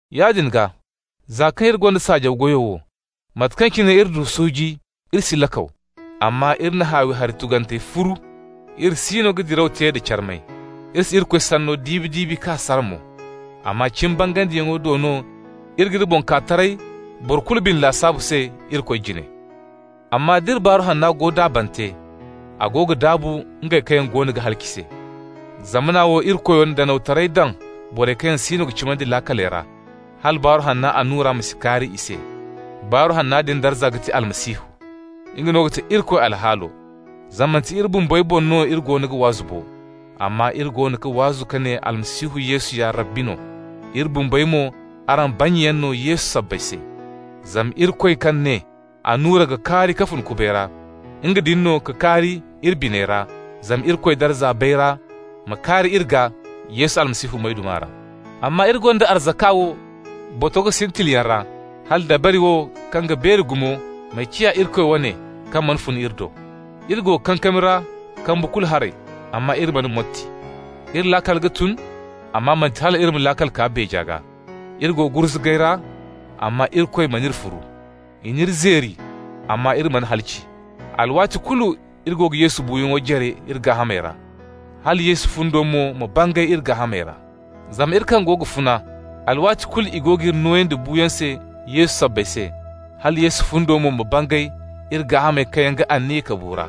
Yaadin gaa, za kaŋ iri gonda saajaw goyo wo, mate kaŋ cine iri du suuji, iri si lakaw. Amma iri na haawi hari tugantey furu. Iri siino ga diraw te da carmay. Iri si Irikoy Sanno diibi-diibi k'a sara mo. Amma cimi bangandiyaŋo do no iri g'iri boŋ kaa taray boro kulu bine lasaabu se Irikoy jine. Amma d'iri Baaru Hanna go daabante, a go ga daabu ngey kaŋ yaŋ goono ga halaci se. Zamana wo irikoyo na danawtaray daŋ borey kaŋ yaŋ si ga cimandi laakaley ra, hala Baaru Hanna annura ma si kaari i se. Baaru Hanna din darza ga ti Almasihu. Nga no ga ti Irikoy alhaalo. Zama manti iri bumbey boŋ no iri goono ga waazu bo, amma iri goono ga waazu ka ne Almasihu Yesu ya Rabbi no, iri bumbey mo, araŋ bannyayaŋ no Yesu sabbay se. Zama Irikoy kaŋ ne: «Annura ga kaari ka fun kubay ra,» nga din no ka kaari iri biney ra zama Irikoy darza bayra ma kaari iri gaa Yesu Almasihu moyduma ra. Amma iri gonda arzaka wo botogo sintiliyaŋ ra, hala dabari wo kaŋ ga beeri gumo ma ciya Irikoy wane, kaŋ mana fun iri do. Iri go kankami ra kambu kulu haray, amma iri mana motti. Iri laakal ga tun, amma manti hal iri ma laakal kaa beeja gaa. Iri go gurzugay ra, amma Irikoy mana iri furu. I n'iri zeeri, amma iri mana halaci. Alwaati kulu iri go ga Yesu buuyaŋo jare iri gaahamey ra, hala Yesu fundo mo ma bangay iri gaahamey ra. Zama iri kaŋ go ga funa, alwaati kulu i go g'iri nooyandi buuyaŋ se Yesu sabbay se, hala Yesu fundo mo ma bangay iri gaahamey kaŋ ga aniya ka bu ra.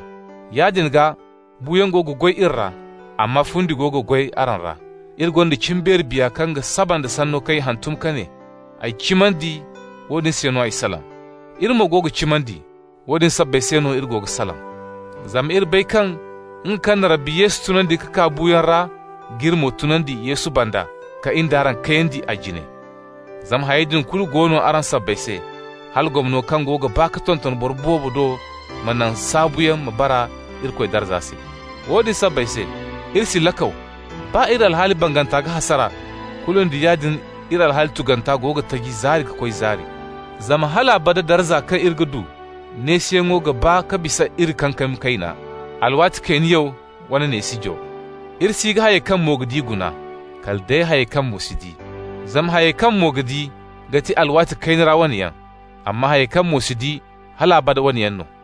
Yaadin gaa, buuyaŋ go ga goy iri ra, amma fundi go ga goy araŋ ra. Iri gonda cimbeeri biya kaŋ ga saba nda sanno kaŋ i hantum ka ne: «Ay cimandi, woodin se no ay salaŋ.» Iri mo go ga cimandi, woodin sabbay se no iri go ga salaŋ. Zama iri bay kaŋ nga kaŋ na Rabbi Yesu tunandi ka kaa buuyaŋ ra g'iri mo tunandi Yesu banda, ka in d'araŋ kayandi a jine. Zama hayey din kulu go no araŋ sabbay se, hala gomno kaŋ go ga baa ka tonton boro boobo do ma naŋ saabuyaŋ ma baa Irikoy darza se. Woodin sabbay se, iri si lakaw. Baa iri alhaali banganta ga hasara, kulu nda yaadin iri alhaali tuganta go ga taji zaari ka koy zaari. Zama hal abada darza kaŋ iri ga du neesiyaŋo ga baa ka bisa iri kankami kayna, alwaati kayniyaw wane neesijo. Iri si ga hayey kaŋ mo ga di guna, kala day hayey kaŋ mo si di. Zama hayey kaŋ mo ga di ga ti alwaati kayna ra wane yaŋ. Amma hayey kaŋ mo si di, hal abada wane yaŋ no.